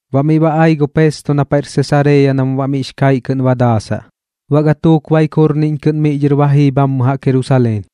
Baꞌ miꞌ ba ai gu Pesto na paiꞌr Sesareeya nam baꞌ miꞌx kaiꞌ kɨꞌn ba daasaꞌ. Baꞌ gatuuk baik jurniꞌñ kɨꞌn miꞌ dhɨr ma jii bhammɨ jaꞌk Jerusaleen.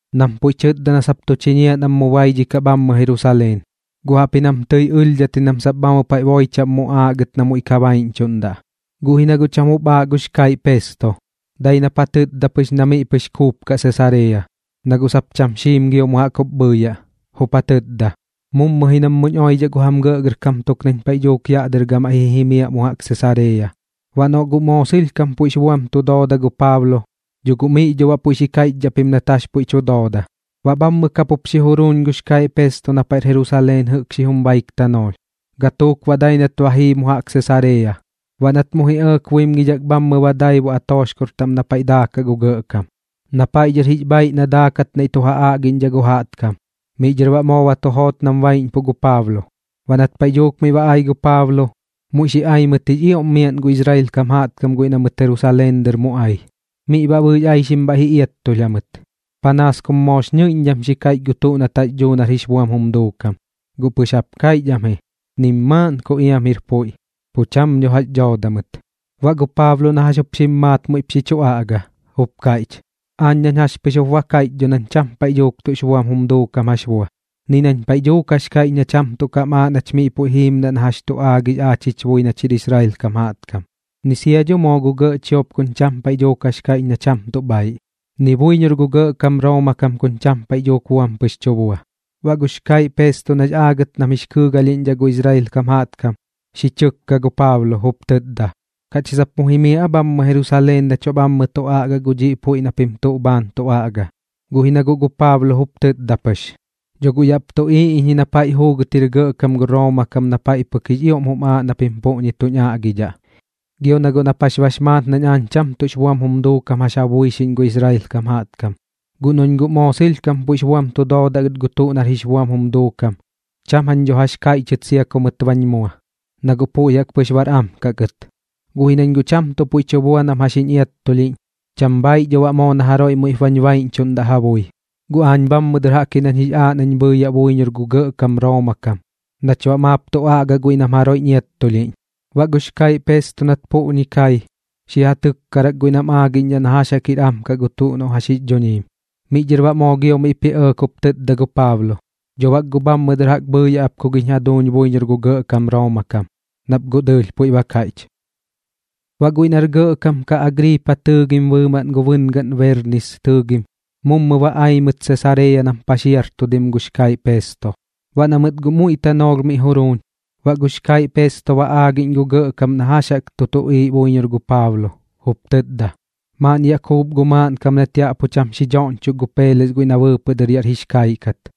nam puiꞌ tɨtda na sap tu chiñiaꞌ nam mu baidhikaꞌ bhammɨ Jerusaleen. Guꞌ jaꞌpji nam tɨi ɨlhdhat ji nam sap bhammɨ paiꞌ boi chaꞌm muꞌaaꞌ gɨt nam muiꞌ ka baiꞌñchuꞌndaꞌ. Guꞌ ji na guꞌ cham jup aaꞌ gux kaiꞌ Pesto, dai nap ja tɨtda pɨx na miꞌ pɨx kuupkaꞌ Sesareeya, na guꞌ sap cham xiim gio mu jaꞌk jup bhɨɨyaꞌ. Jup ja tɨtda: ―Mummɨ ji nam muñ oidhaꞌ gu jam gɇꞌgɇrkam tuk nañ paiꞌ dhuuk yaꞌ dɨr gamaiꞌ ji jimiaꞌ mu jaꞌk Sesareeya. Baꞌ noꞌ guꞌ moo sɨlhkam puiꞌx buam tu dooda gu Paablo, dho guꞌ miꞌ dho baꞌ puiꞌ xi kaiꞌchdhaꞌ pim nat jax puiꞌ tu dooda. Baꞌ bhammɨ ka pup xi juruuñ gux kaiꞌ Pesto na paiꞌr Jerusaleen jɨꞌk xijum baik tanoolh, gatuuk baꞌ dai nat ba jii mu jaꞌk Sesareeya. Baꞌ nat mu ji ɇɇk buimgidhak bhammɨ ba daibu atooxkor taꞌm na paiꞌ daakaꞌ gu gɇꞌkam, na paiꞌ dhɨr jix bhaaiꞌ na daakat naiꞌ tu ja aꞌgiꞌñdhaꞌ gu jaꞌtkam. Miꞌ dhɨr baꞌ moo ba tu joot nam baiꞌñpuꞌ gu Paablo. Baꞌ nat paiꞌ dhuuk miꞌ ba ai gu Paablo, muiꞌ xi ai mɨt jix ioꞌm miaꞌn gu Israel kam jaꞌtkam guiꞌ na mɨt Jerusaleen dɨr mu ai. Miꞌ baꞌ bɨɨx aixim bhaiꞌ ji iattulh jamɨt, panaas kum moox ñɨiꞌñdham xi kaiꞌch gu tuꞌ nat jax dhuu nar jix buam jum duukam. Guꞌ pɨx jaꞌp kaiꞌch am ji, nim maaꞌn ku iam jir puiꞌ, pu cham dho jax dhooda mɨt. Baꞌ gu Paablo na jax jup xim maat muiꞌp ji chu aꞌga, jup kaiꞌch: ―Aañ nañ jax pɨx jup ba kaiꞌch dho nañ cham paiꞌ dhuuk tuꞌx buam jum duukam jax bua, ni nañ paiꞌ dhuuk jax kaiꞌch na cham tuꞌ kam aaꞌ nach miꞌ puiꞌ jiimdaꞌ na jax chu aagix aach jich bui nach jir Israel kam jaꞌtkam, ni sia dho moo gu gɇꞌ chiop kuñ cham paiꞌ dhuuk jax kaiꞌch na cham tuꞌ bhaiꞌ, ni buiñor gu gɇꞌkam Rooma kam kuñ cham paiꞌ dhuuk buam pɨx tu bua. Baꞌ gux kaiꞌ Pesto nax aagɨt nam jix kɨɨgalhiꞌñdhaꞌ gu Israel kam jaꞌtkam, xi chɨkka gu Paablo, jup tɨtda: ―¿Kaꞌch ji sap mu jimiaꞌ aa bhammɨ Jerusaleen nach baꞌ bhammɨ tu aꞌgaꞌ gu dhiꞌ puiꞌ na pim tuꞌ bhaan tu aꞌga? Guꞌ ji na guꞌ gu Paablo jup tɨtda pɨx: ―Dho guꞌ yaꞌp tuꞌiiꞌ iñ ji na paiꞌ juugɨt jir gɇꞌkam gu Rooma kam na paiꞌ pɨk jix ioꞌm jum aaꞌ na pim puꞌñi tuñ aꞌgidhaꞌ. Gio na guꞌ nap jax bax maat nañ aañ cham tuꞌx buam jum duukam jax ja buixiꞌñ gu Israel kam jaꞌtkam. Guꞌ noꞌñ guꞌ moo sɨlhkam puiꞌx buam tu doodaꞌ gɨt gu tuꞌ nar jix buam jum duukam, cham jañ dho jax kaiꞌchɨt sia ku mɨt bañ mua, na guꞌ puiꞌ jaꞌk pɨx bar am kaꞌ gɨt. Guꞌ ji nañ guꞌ cham tuꞌ puiꞌ tu bua nam jax jiñ iattulhiꞌñ, cham bhaiꞌ dho baꞌ moo na jaroiꞌ muiꞌp bañ baiꞌñchuꞌndaꞌ ja bui. Guꞌ aañ bhammɨ dɨr jaꞌk ji nañ jix aaꞌ nañ bhɨɨyaꞌ buiñor gu gɇꞌkam Rooma kam nach baꞌ maap tu aꞌgaꞌ guiꞌ nam jaroiꞌñ iattulhiꞌñ. Baꞌ gux kaiꞌ Pesto nat puꞌñi kai, xi ja tɨkkarak guiꞌ nam aagiꞌñdhaꞌ na jax jaꞌk jir am kaꞌ gu tuꞌ noꞌ jax jix dhuñiim. Miꞌ dhɨr baꞌ moo gio miꞌp ji ɇɇk jup tɨtda gu Paablo: ―Dho bak guꞌ bhammɨ dɨr jaꞌk bhɨɨyaꞌ ap ku giñ jaduuñ buiñor gu gɇꞌkam Rooma kam, nap guꞌ dɨɨlh puiꞌ ba kaiꞌch. Baꞌ guiꞌ nar gɇꞌkam kaꞌ Agriipa tɨɨgim bɨɨmaꞌn gu bɨngaꞌn Berniis tɨɨgim mummɨ ba ai mɨt Sesareeya nam paxiartudim gux kaiꞌ Pesto. Baꞌ na mɨt guꞌ muiꞌ tanoolh miꞌ juruuñ, baꞌ gux kaiꞌ Pesto ba aagiꞌñ gu gɇꞌkam na jax jaꞌk tu tuꞌiiꞌ buiñor gu Paablo, jup tɨtda: ―Maaꞌn yaꞌ kuup gu maaꞌnkam nat yaꞌ pu cham xi doꞌñchok gu Peeles guiꞌ na bɨɨpɨꞌ dɨr yaꞌr jix kaiꞌ kat.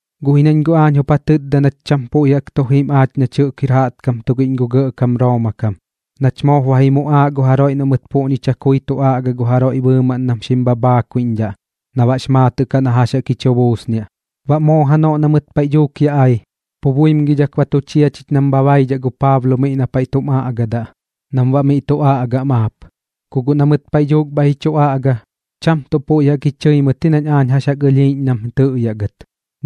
Guꞌ ji nañ guꞌ aañ jup ja tɨtda nach cham tuꞌ puiꞌ jaꞌk tu jim aach nach jɨꞌk jir jaꞌtkam tugiꞌñ gu gɇꞌkam Rooma kam nach moop ba ji muꞌaaꞌ gu jaroiꞌ noꞌ mɨt puꞌñi chakui tu aꞌga gu jaroiꞌ bɨɨmaꞌn nam xim bhabhaakuiꞌñdhaꞌ na baꞌx maatɨꞌ kaꞌ na jax jaꞌk jix chu buusniaꞌ. Baꞌ moo janoꞌ na mɨt paiꞌ dhuuk yaꞌ ai, pu buimgidhak ba tu chia chich nam bha baidhaꞌ gu Paablo miꞌ na paiꞌ tum aꞌgadaꞌ nam baꞌ miꞌ tu aꞌgaꞌ maap. Ku guꞌ na mɨt paiꞌ dhuuk bhaiꞌ ji chu aꞌga, cham tuꞌ puiꞌ jaꞌk ji chɨi mɨt ji nañ aañ jax jaꞌk ɨlhiiꞌñ nam tɨꞌyaꞌ gɨt,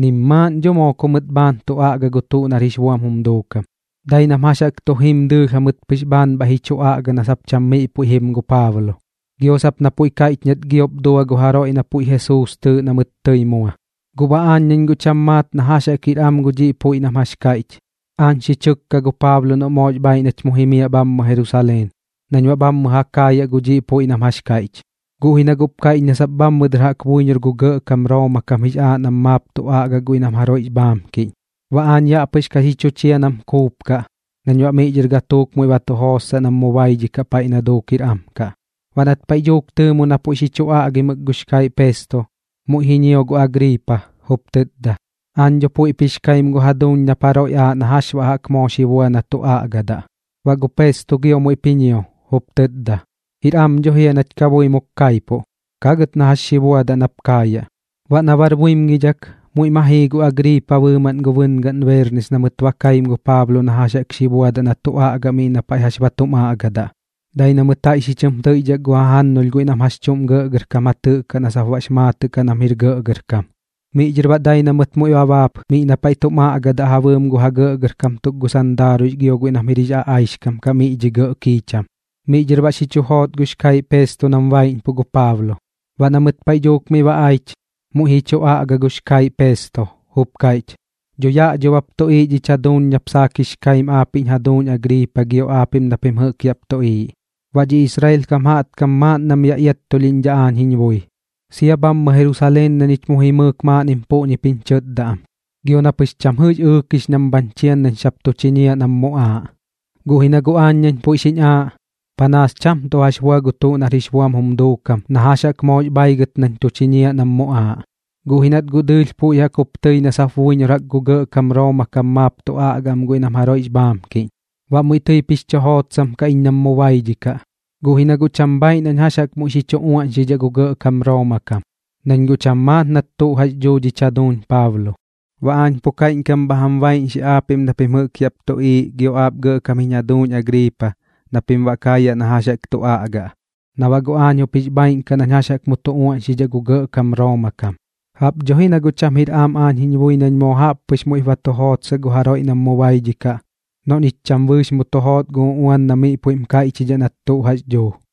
nim maaꞌn dho moo ku mɨt bhaan tu aꞌga gu tuꞌ nar jix buam jum duukam. Dai nam jax jaꞌk tu jim dɨɨlh jamɨt pɨx bhaan bhaiꞌ ji chu aꞌga na sap cham miꞌ puiꞌ jim gu Paablo, gio sap na puiꞌ kaiꞌch nat giop dua gu jaroiꞌ na puiꞌ tɨɨꞌ Jesuus na mɨt tɨi mua. Guꞌ baꞌ aañ nañ guꞌ cham maat na jax jaꞌk jir am gu dhiꞌ puiꞌ nam jax kaiꞌch, aañ xi chɨkka gu Paablo noꞌ moox bhaiꞌ nach mu jimiaꞌ bhammɨ Jerusaleen nañ baꞌ bhammɨ ja kaayaꞌ gu dhiꞌ puiꞌ nam jax kaiꞌch. Guꞌ ji na guꞌp kaiꞌch na sap bhammɨ dɨr jaꞌk buiñor gu gɇꞌkam Rooma kam jix aaꞌ nam maap tu aꞌgaꞌ guiꞌ nam jaroiꞌx bhaamkiꞌñ. Baꞌ aañ yaꞌ pɨx ka xi chu chia nam kuupkaꞌ nañ baꞌ miꞌ dhɨr gatuuk muiꞌ ba tu jootsaꞌ nam mu baidhikaꞌ paiꞌ na duuk jir am kaꞌ. Baꞌ nat paiꞌ dhuuk tɨɨmu na puiꞌ xi chu aꞌgimɨk gux kaiꞌ Pesto, muiꞌ ji ñio gu Agriipa, jup tɨtda: ―Aañ dho puiꞌp jix kaim gu jaduuñ nap jaroiꞌ aaꞌ na jax baꞌ jaꞌk moo xi bua na tu aꞌgadaꞌ. Baꞌ gu Pesto gio muiꞌp ji ñio, jup tɨtda: ―Jir am dho jia nach kabuimuk kaipuꞌ. Kagɨt na jax xi buadaꞌ nap kaayaꞌ. Baꞌ na bar buimgidhak, muiꞌ ma jii gu Agriipa bɨɨmaꞌn gu bɨngaꞌn Berniis na mɨt ba kaim gu Paablo na jax jaꞌk xi buadaꞌ na tu aꞌgaꞌ miꞌ na paiꞌ jax ba tum aꞌgadaꞌ. Dai na mɨt jaiꞌ xi chɨm tɨiꞌdhak gu jajannulh guiꞌ nam jax chuꞌm gɇꞌgɇrkam ja tɨꞌkaꞌ na sap baꞌx maatɨꞌ kaꞌ nam jir gɇꞌgɇrkam. Miꞌ dhɨr baꞌ dai na mɨt muiꞌ ba baap miꞌ na paiꞌ tum aꞌgadaꞌ ja bɨɨm gu ja gɇꞌgɇrkam tuk gu sandaaruiꞌx gio guiꞌ nam jɨꞌk jir aꞌaixkam miꞌ dhi gɇꞌ kiicham. Miꞌ dhɨr baꞌ xi chu joot gux kaiꞌ Pesto nam baiꞌñpuꞌ gu Paablo. Baꞌ na mɨt paiꞌ dhuuk miꞌ ba aich, muiꞌ ji chu aꞌga gux kaiꞌ Pesto, jup kaiꞌch: ―Dho yaꞌ dho bap tuꞌiiꞌ dhich jaduuñ nap saak jix kaim aapiꞌñ jaduuñ Agriipa gio aapiꞌm na pim jɨꞌk yaꞌp tuꞌiiꞌ. Baꞌ dhiꞌ gu Israel kam jaꞌtkam maaꞌn nam yaꞌ iattulhiꞌñ aañ jiñ bui, sia bhammɨ Jerusaleen na ñich mu jimɨɨk maaꞌnnim puꞌñip jiñ chɨtda am, gio na pɨx cham jɨꞌx ɨɨkix nam bhañ chian nañ sap tu chiñiaꞌ nam muꞌaaꞌ. Guꞌ ji na guꞌ aañ nañ puiꞌ xiñ aaꞌ, panaas cham tuꞌ jax bua gu tuꞌ nar jix buam jum duukam na jax jaꞌk moox bhaigɨt nañ tu chiñiaꞌ nam muꞌaaꞌ. Guꞌ ji nat guꞌ dɨɨlh puiꞌ jaꞌk jup tɨi na sap buiñor jaꞌk gu gɇꞌkam Rooma kam maap tu aꞌgaꞌ am guiꞌ nam jaroiꞌx bhaamkiꞌñ, baꞌ muiꞌ tɨip jix chu jootsam kaꞌ iñ nam mu baidhikaꞌ. Guꞌ ji na guꞌ cham bhaiꞌ nañ jax jaꞌk muiꞌ xi chu uaꞌñxidhaꞌ gu gɇꞌkam Rooma kam, nañ guꞌ cham maat nat tuꞌ jax dhuu dhich jaduuñ Paablo. Baꞌ aañ pu kaiꞌñkam bha jam baiꞌñxi xib aapiꞌm na pim jɨꞌk yaꞌp tuꞌiiꞌ gio aap gɇꞌkam jiñ jaduuñ Agriipa, na pim baꞌ kaayaꞌ na jax jaꞌk tu aꞌgaꞌ na baꞌ guꞌ aañ jup jix bhaaiꞌn kaꞌ nañ jax jaꞌk mu tu uaꞌñxidhaꞌ gu gɇꞌkam Rooma kam. Jaꞌp dho ji na guꞌ cham jir am aañ jiñ bui nañ moo jaꞌp pɨx muiꞌp ba tu jootsaꞌ gu jaroiꞌ nam mu baidhikaꞌ noꞌ ñich cham bɨɨx mu tu joot gu uꞌuan na puiꞌm kaiꞌchidhaꞌ nat tuꞌ jax dhuu.